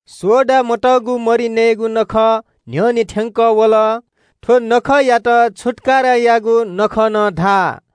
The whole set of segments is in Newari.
सोडा मतःगु मरि नयेगु नखः न्‍ह्यःने थ्‍यंकः वल। थ्‍व नखःया न्‍हापांगु दिं छुत्‍काराया नखः खः।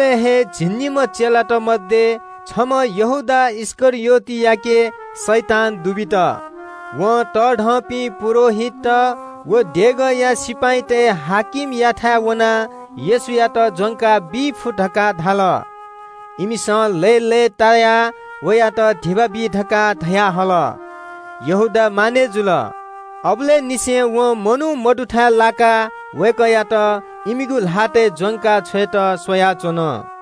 उबलय् हे झिंनिम्‍ह चेलात मध्‍ये छम्‍ह यहूदा इस्‍करियोतयाके शैतान दुबित। वं तःधंपिं पुजाहारीत व देगःया सिपाइँतय् कप्‍तानयाथाय् वनाः येशूयात ज्‍वंका बी फु धकाः धाल। इमिसं लय्‌लय्‌तायाः वयात धिबा बी धकाः धयाहल। यहूदा मानय् जुल। अबलय् निसें वं मनू मदुथाय् लाकाः वय्‌कःयात इमिगु ल्‍हातय् ज्‍वंका छ्वयेत स्‍वयाच्‍वन।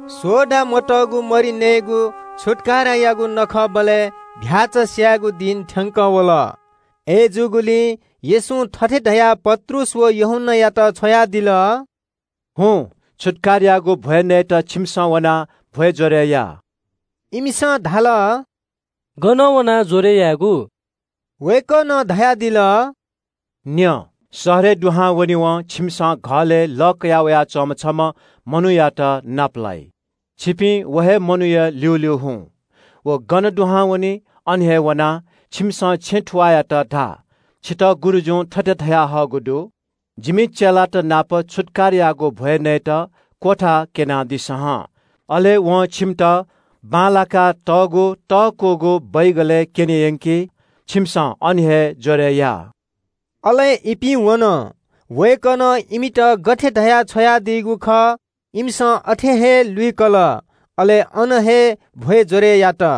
सोडा मतःगु मरि नयेगु छुत्‍कारायागु नखःबलय् चीधिकःम्‍ह भ्‍याःचा स्‍यायेगु दिं थ्‍यंकः वल। अय्‌जूगुलिं येशूं थथे धयाः पत्रुस व यूहन्‍नायात छ्वयादिल – “हुँ, छुत्‍काराया नखःया भ्‍वय् नयेत छिमिसं वनाः भ्‍वय् ज्‍वरय् या।” इमिसं धाल – “गन वनाः ज्‍वरय् यायेगु?” वय्‌कलं धयादिल – “न्‍यँ, शहरय् दुहां वनेवं छिमिसं घलय् लः कया वयाच्‍वंम्‍ह छम्‍ह मनूयात नापलाइ। छिपिं व हे मनूया ल्‍यूल्‍यू हुँ। व गन दुहां वनी, अन हे वनाः छिमिसं छेँ थुवाःयात धा – ‘छितः गुरुजुं थथे धयाहःगु दु – “जिमि चेलात नाप छुत्‍काराया नखःया भ्‍वय् नयेत क्‍वथा क्‍यनादिसँ हं।”’ अले वं छिमित बांलाकातःगु तःकूगु च्‍वतय् क्‍यने यंकी, छिमिसं अन हे ज्‍वरय् या।” अले इपिं वन। वय्‌कलं इमित गथे धया छ्वयादीगु खः, इमिसं अथे हे लुइकल, अले अन हे छुत्‍काराया नखःया भ्‍वय् ज्‍वरय् यात।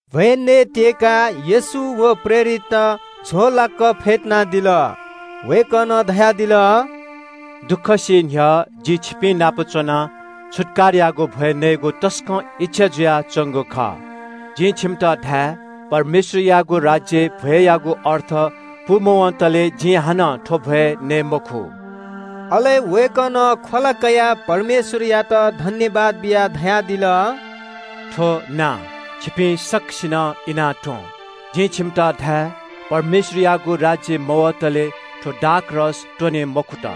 भ्‍वय् नयेत्‍यय्‌काः येशू व प्रेरितत झ्‍वःलाक फ्‍यतुनादिल। वय्‌कलं धयादिल – “दुःख सी न्‍ह्यः जि छिपिंनाप च्‍वनाः छुत्‍काराया नखःया भ्‍वय् नयेगु तसकं इच्‍छा जुयाच्‍वंगु खः। जिं छिमित धाये – परमेश्‍वरयागु राज्‍यय् भ्‍वय्‌यागु अर्थ पूमवंतले जिं हानं थ्‍व भ्‍वय् नये मखु।” अले वय्‌कलं ख्‍वला कयाः परमेश्‍वरयात सुभाय् बियाः धयादिल – “थ्‍व का, छिपिं सकसिनं इनाः त्‍वँ। जिं छिमित धाये – परमेश्‍वरयागु राज्‍य मवतले थ्‍व दाखमद्य त्‍वने मखुत।”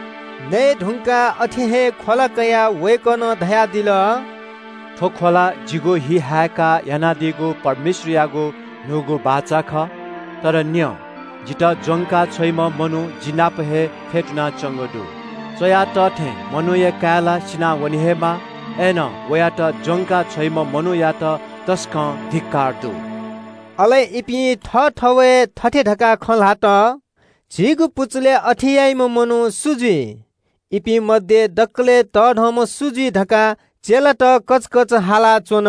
नये धुंकाः अथे हे ख्‍वला कयाः वय्‌कलं धयादिल – “थ्‍व ख्‍वला छिमिगु निंतिं जिगु हि हाय्‌कागु परमेश्‍वरयागु न्‍हूगु बाचा खः। “तर न्‍यँ, जितः ज्‍वंका छ्वइम्‍ह मनू जि नाप हे फ्‍यतुनाच्‍वंगु दु। च्‍वया तः थें मनूया काय् ला सिनावने हे माः। अय्‌नं वयात ज्‍वंका छ्वइम्‍ह मनूयात तसकं धिक्‍कार दु।” अले इपिं थःथवय् थथे धकाः खँ ल्‍हात – “झीगु पुचलय् अथे याइम्‍ह मनू सु जुइ?” सु तःधं? इपिं मध्‍ये दकलय् तःधंम्‍ह सु जुइ धकाः चेलात कचकच हालाच्‍वन।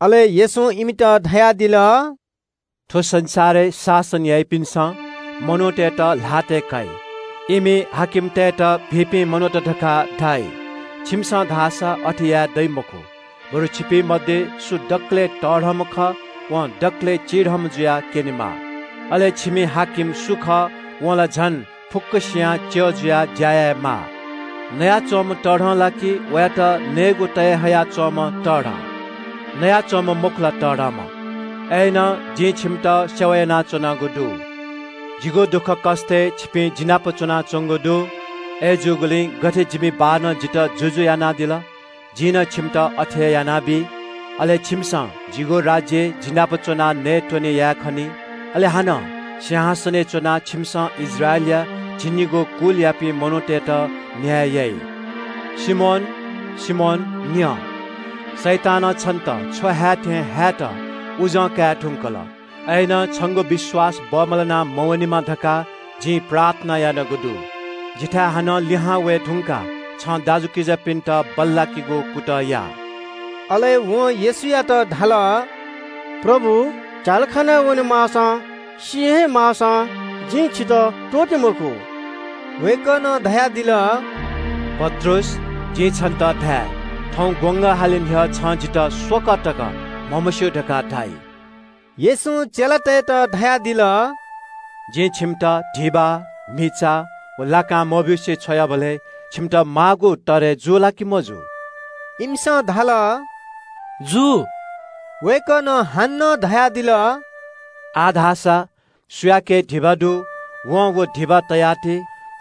अले येशूं इमित धयादिल – “थ्‍व संसारय् शासन याइपिन्‍सं मनूतय्‌त ल्‍हातय् काइ। इमि हाकिमतय्‌त भिंपिं मनूत धकाः धाइ। छिमिसं धाःसा अथे यायेदइ मखु, बरु छिपिं मध्‍ये सु दकलय् तःधंम्‍ह खः वं दकलय् चिधंम्‍ह जुयाः क्‍यनेमाः। अले छिमि नायः सु खः वं ला झन फुक्‍कसियां च्‍यः जुयाः ज्‍या यायेमाः। नयाच्‍वंम्‍ह तःधं ला कि वयात नयेगु तये हया च्‍वंम्‍ह च्‍यः तःधं? नयाच्‍वंम्‍ह मखु ला, तःधंम्‍ह? अय्‌नं जिं छिमित सेवा यानाच्‍वनागु दु। “जिगु दुःखकष्‍टय् छिपिं जि नाप च्‍वनाच्‍वंगु दु। अय्‌जूगुलिं गथे जिमि बाःनं जितः जुजु यानादिल, जिं नं छिमित अथे हे यानाबी। अले छिमिसं जिगु राज्‍यय् जि नाप च्‍वनाः नयेत्‍वने याये खनी। अले हानं सिंहासनय् च्‍वनाः छिमिसं इस्राएलया झिंनिगू कुलयापिं मनूतय्‌त न्‍याय याइ।” “सिमोन, सिमोन न्‍यँ, शैतानं छिमित छ्व हाये थें हायेत उजं काये धुंकल। अय्‌नं छंगु विश्‍वास बमलाना मवनेमा धकाः जिं प्रार्थना यानागु दु। जिथाय् हानं लिहां वये धुंकाः छं थः दाजुकिजापिन्‍त बल्‍लाकि।” अले वं येशूयात धाल – “प्रभु, झ्‍यालखानाय् वनेमाःसां, सी हे माःसां जिं छितः त्‍वःते मखु।” वय्‌कलं धयादिल – “पत्रुस, जिं छन्‍त धाये – थौं खा हाले न्‍ह्यः छं जितः स्‍वकः तक म्‍हमस्‍यू धकाः धाइ।” येशूं चेलातय्‌त धयादिल – “जिं छिमित धिबा, म्‍हिचा व लाकां मब्‍यूसे छ्वयाबलय् छिमित माःगु तरय् जू ला कि मजू?” इमिसं धाल – “जू।” वय्‌कलं हानं धयादिल – “आः धाःसा सुयाके धिबा दु, वं व धिबा तयाति,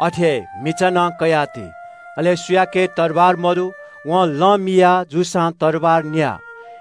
अथे हे म्‍हिचा नं कयाः ति। अले सुयाके तरवार मदु वं थःगु कोट मिया जूसां तरवार न्‍या।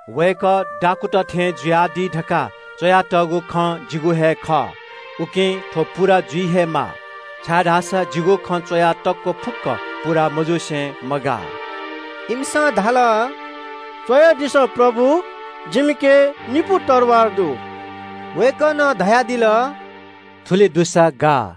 ‘वय्‌कःयात दाखुँतय् ल्‍याखय् तइ’ धकाः जिगु बारे धर्मशास्‍त्रय् च्‍वयातःगु खँ पूवने हे माः। छाय्‌धाःसा जिगु बारे च्‍वयातःगु खँ पूवनाच्‍वंगु दु।” इमिसं धाल – “स्‍वयादिसँ प्रभु, जिमिके निपु तरवार दु।” वय्‌कलं धयादिल – “थुलि दुसा गाः।”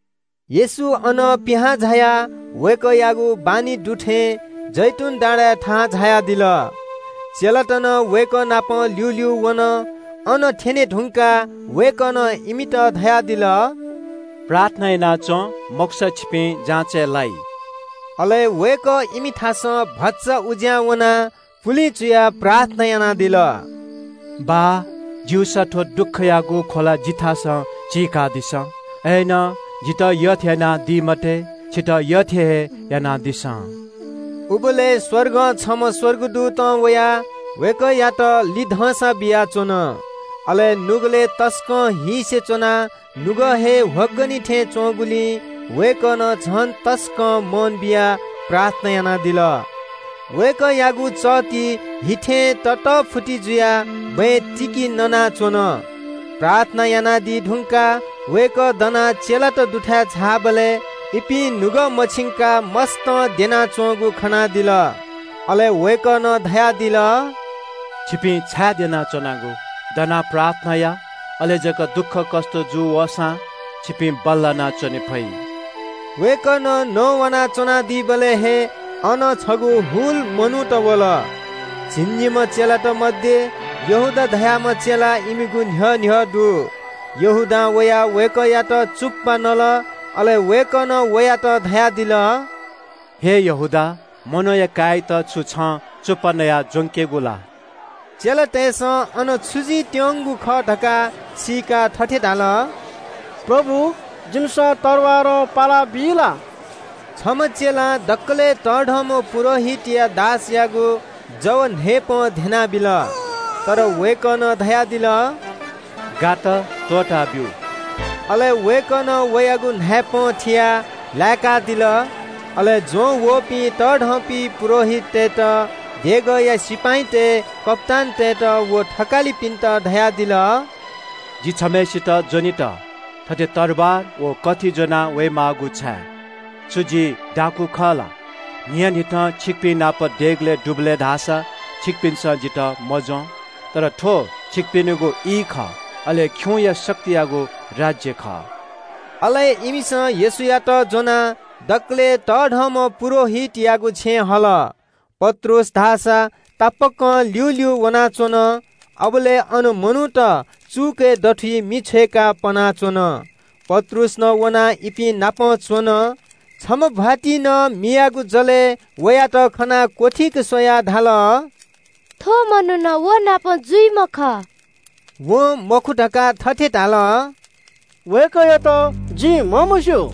येशू अनं पिहां झायाः वय्‌कःयागु बानी दु थें जैतून डाँडाय् थाहां झायादिल। चेलात नं वय्‌कः नाप ल्‍यूल्‍यू वन। अन थ्‍यने धुंकाः वय्‌कलं इमित धयादिल – “प्रार्थना याना च्‍वँ, मखुसा छिपिं जाँचय् लाइ।” अले वय्‌कः इमिथासं भचा उज्‍यां वनाः पुलिं चुयाः प्रार्थना यानादिल। “बाः, ज्‍यूसा थ्‍व ख्‍वला जिथासं चीकादिसँ। अय्‌नं जितः यःथें यानादी मते, छितः यःथें हे यानादिसँ।” उबलय् स्‍वर्गं छम्‍ह स्‍वर्गदूतं वयाः वय्‌कःयात लिधंसा बियाच्‍वन। अले नुगलय् तसकं हीसे च्‍वनाः नुगः हे ह्वगनि थें च्‍वंगुलिं वय्‌कलं झन तसकं मन बियाः प्रार्थना यानादिल। वय्‌कःयागु चःति हि थें ततःफुति जुयाः बँय् तिकि ननाच्‍वन। प्रार्थना यानादी धुंकाः वय्‌कः दनाः चेलात दुथाय् झाःबलय् इपिं नुगः मछिंकाः मस्‍तं द्यनाच्‍वंगु खनादिल। अले वय्‌कलं धयादिल – “छिपिं छाय् द्यनाच्‍वनागु? दनाः प्रार्थना या। अले जक दुःखकष्‍ट जू वःसां छिपिं बल्‍लाना च्‍वने फइ।” वय्‌कलं नवाना च्‍वनादीबलय् हे अन छगू हुल मनूत वल। झिंनिम्‍ह चेलात मध्‍ये यहूदा धाःम्‍ह चेला इमिगु न्‍ह्यः न्‍ह्यः दु। यहूदां वयाः वय्‌कःयात चुप्‍पा नल। अले वय्‌कलं वयात धयादिल – “हे यहूदा, मनूया काय्‌यात छु छं चुप्‍पा नयाः ज्‍वंकेगु ला?” चेलातय्‌सं अन छु जुइत्‍यंगु खः धकाः सीकाः थथे धाल – “प्रभु, जिमिसं तरवारं पालाबी ला?” छम्‍ह चेलां दकलय् तःधंम्‍ह पुजाहारीया दासयागु जव न्‍हाय्‌पं ध्‍यनाबिल। तर वय्‌कलं धयादिल – “गात, त्‍वःताब्‍यु।” अले वय्‌कलं वयागु न्‍हाय्‌पं थियाः लाय्‌कादिल। अले ज्‍वंवःपिं तःधंपिं पुजाहारीतय्‌त, देगःया सिपाइँतय् कप्‍तानतय्‌त व थकालिपिन्‍त धयादिल – “जि छम्‍हय्‌सित ज्‍वनेत थथे तरवार व कथि ज्‍वनावये माःगु छाय्? छु जि दाखुँ खः ला? न्‍हियान्‍हिथं छिकपिं नाप देगलय् दुबलय् धाःसा छिकपिन्‍सं जितः मज्‍वं। तर थ्‍व छिकपिनिगु ई खः, अले खिउँया शक्तियागु राज्‍य खः।” अले इमिसं येशूयात ज्‍वनाः दकलय् तःधंम्‍ह पुजाहारीयागु छेँय् हल। पत्रुस धाःसा तापाकं ल्‍यूल्‍यू वनाच्‍वन। अबलय् अन मनूत चुकय् दथुइ मि छ्वय्‌काः पनाच्‍वन। पत्रुस नं वनाः इपिं नाप च्‍वन। छम्‍ह भ्‍वातिं नं मियागु जलय् वयात खनाः क्‍वथीक स्‍वयाः धाल – “थ्‍व मनू नं व नाप जुइम्‍ह खः।” वं मखु धकाः थथे धाल – “वय्‌कःयात जिं म्‍हमस्‍यू।”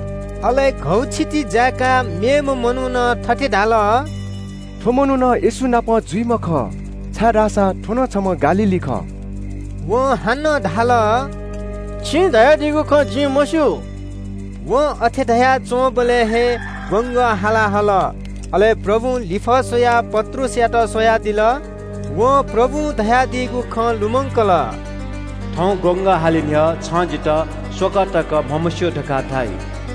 अले घौछिति जाय्‌काः मेम्‍हय्‌सिनं थथे धाल – “थ्‍व मनू येशू नाप जुइम्‍ह खः, छाय्‌धाःसा थ्‍व नं छम्‍ह गालीली खः।” वं हानं धाल – “छिं धयादीगु खँ जिं मस्‍यू।” वं अथे धयाच्‍वंबलय् हे खा हाला हाल। अले प्रभुं लिफः स्‍वयाः पत्रुसयात स्‍वयादिल। वं प्रभुं धयादीगु खँ लुमंकल – “थौं खा हाले न्‍ह्यः छं जितः स्‍वकः तक म्‍हमस्‍यू धकाः धाइ।”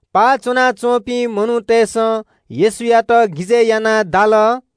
पाः च्‍वनाच्‍वंपिं मनूतय्‌सं येशूयात गिजय् यानाः दाल।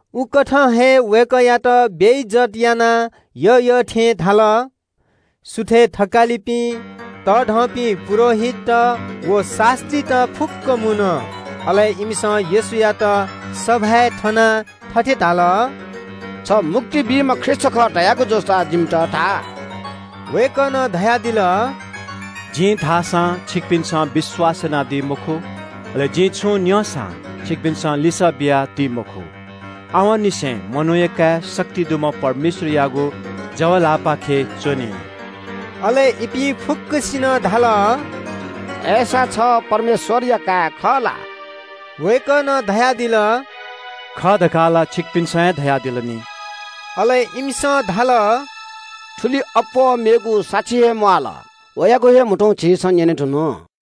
उकथं हे वय्‌कःयात बेइज्‍जत यानाः यःयःथें धाल। सुथय् थकालिपिं, तःधंपिं पुजाहारीत व शास्‍त्रीत फुक्‍कं मुन। अले इमिसं येशूयात सभाय् थनाः थथे धाल – “छ मुक्ति बीम्‍ह ख्रीष्‍ट खः धयागु जूसा जिमित धा।” वय्‌कलं धयादिल – “जिं धाःसां छिकपिन्‍सं विश्‍वास यानादी मखु। अले जिं छुं न्‍यंसां छिकपिन्‍सं लिसः बियादी मखु। आवंनिसें मनूया काय् शक्ति दुम्‍ह परमेश्‍वरयागु जव ल्‍हाःपाखे च्‍वनी।” अले इपिं फुक्‍कसिनं धाल – “अय्‌सा छ परमेश्‍वरया काय् खः ला?” वय्‌कलं धयादिल – “खः धकाः ला छिकपिन्‍सं हे धयादिल नि।” अले इमिसं धाल – “थुलिं अप्‍वः मेगु साक्षी हे म्‍वाःल। वयागु हे म्‍हुतुं झीसं न्‍यनेधुन।”